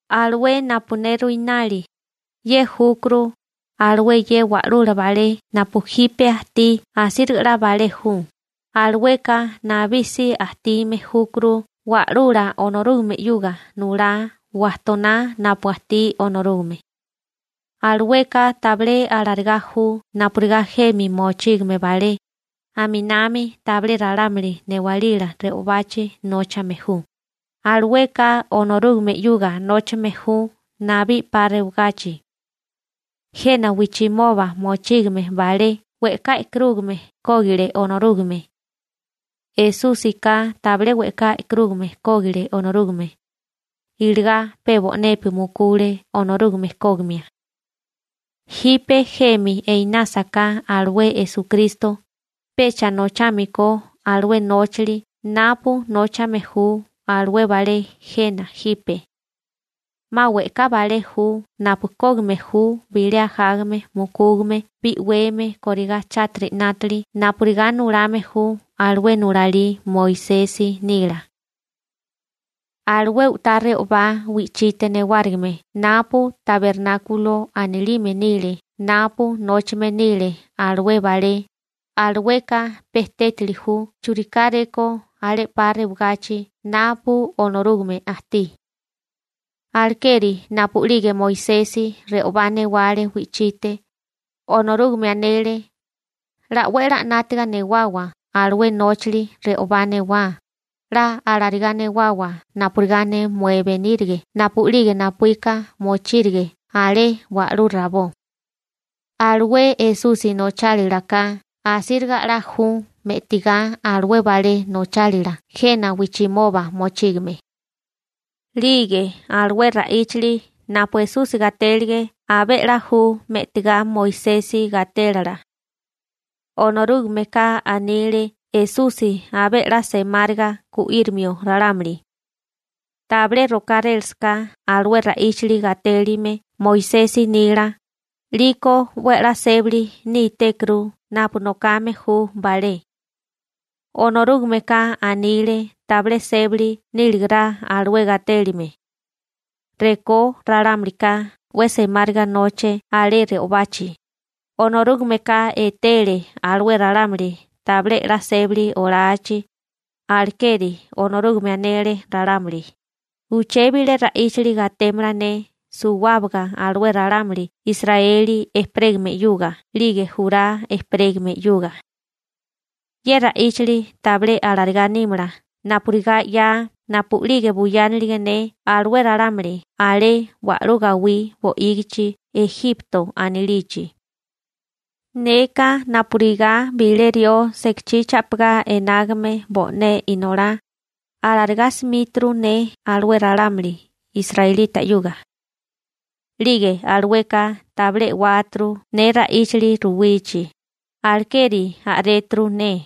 Alué napu ne ruinali, ye júkuru: Alué ye wa'lula balé napu jipe ajtí asíriga 'la balé ju, alueka nabí si ajtime júkuru Wa'lula Onorúgame 'yuga nulá wajtoná napu ajtí Onorúgame. Alueka tabilé alarigá ju napurigá jemi mochígame balé, aminami tabilé ralámuli newalila re'obachi nóchame ju, alueka Onorúgame 'yuga nóchame ju nabí 'pa rewagachi. Jena wijchimoba mochígame balé we'ká e'karúgame kógile Onorúgame. Esúsika tabilé we'ká e'karúgame kógile Onorúgame, iligá pe bo'nepi mukule Onorúgame kógimia. Jipe jemi einásaká alué Esukristo, pecha nochámikó alué nóchali napu nóchame ju alué balé jena jipe. 'Ma we'ká balé ju napu kógime ju bilé ajágame mukúgame bi'weme kórigá chátiri 'nátili napurigá nulame ju alué nulalí Moisesi nila. Alué u'tá re'obá wi'chite newárigime napu tabernákulo anilime nile napu nóchame nile alué balé, alueka pe tétali ju churikáréko alé 'pa rewagachi napu Onorúgame ajtí. Alekeri napu'lige Moisesi re'obá newale wi'chite, Onorúgame anele: «'La 'we a'lá 'nátiga newawa alué nóchali re'obá newá, 'la alarigá newawa napurigá ne mué benírige napu'lige napuíka mochírige alé wa'lú rabó.» Alué Esusi nochálila ka asíriga a'lala ju me'tigá alué balé nochálila jena wijchimoba mochígame. 'Lige alué ra'íchali napu Esusi gatélige abé 'la ju me'tigá Moisesi gatélala. Onorúgameka anile Esusi abé 'la semáriga gu'írimio ralámuli. Tabilé rokárélasaká alué ra'íchali gatélime Moisesi nila, 'liko 'we 'la sébali nítékuru napu nokame ju balé. Onorúgameka anile tabilé sébali níligará alué gatélime. Rekó ralámulika 'we semáriga noche alé re'obachi, Onorúgameka etele alué ralámuli tabilé 'la sébali olachi, alekeri Onorúgame anele ralámuli: Uché bilé ra'íchali gatémala ne suwábaga alué ralámuli Israeli ejperégame 'yuga 'lige Jurá ejperégame 'yuga. Ye ra'íchali tabilé alarigá nímala napurigá 'ya napu'lige buyánilige ne alué ralámuli alé wa'lú gawí bo'ígichi Ejipto anilichi. Neka napurigá bilé rió sekachí cha'pigá enágame bo'né inolá, alarigá simíturu ne alué ralámuli israelita 'yuga. 'Lige alueka tabilé e'wáturu ne ra'íchali ruwichi, alekeri a'réturu ne.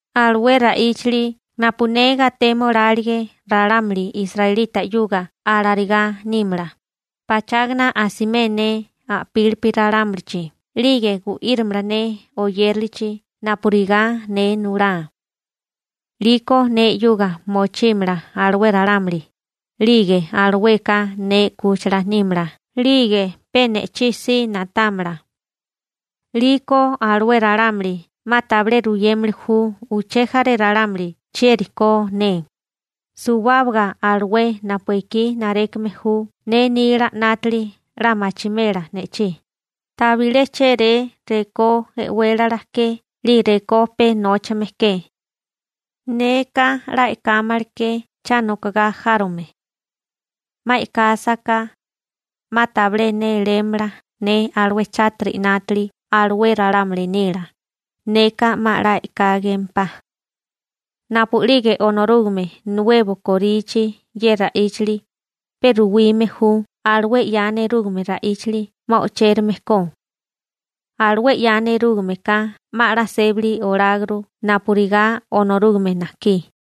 Alué ra'íchali napu ne gatémolálige ralámuli israelita 'yuga alarigá nímala: Pachágana asimé ne a'pílipi ralámulichi 'lige gu'írimala ne oyérilichi napurigá ne nulá. 'Liko ne 'yuga mochímala alué ralámuli, 'lige alueka ne 'kúchila nímala 'lige pe ne'chí si na'támala. 'Liko alué ralámuli 'ma tabilé ruyémili ju uché jaré ralámuli chieri ko ne, suwábaga alué napu ekí narékame ju ne nila 'nátili 'la machimela ne'chí, tabilé chéré rekó e'wélala ke 'lige rekó pe nóchame ke. Neka 'la e'kámala ke cha nokogá járome. 'Ma e'kásaká, 'ma tabilé nélémala ne alué chátiri 'nátili alué ralámuli nila, neka 'ma 'la e'kágempá. Napu'lige Onorúgame nuebo korichi ye ra'íchali, pe ruwime ju alué 'ya nerúgame ra'íchali 'ma o'chérame ko. Alué 'ya nerúgame ka 'ma 'la sébali oláguru napurigá Onorúgame najkí.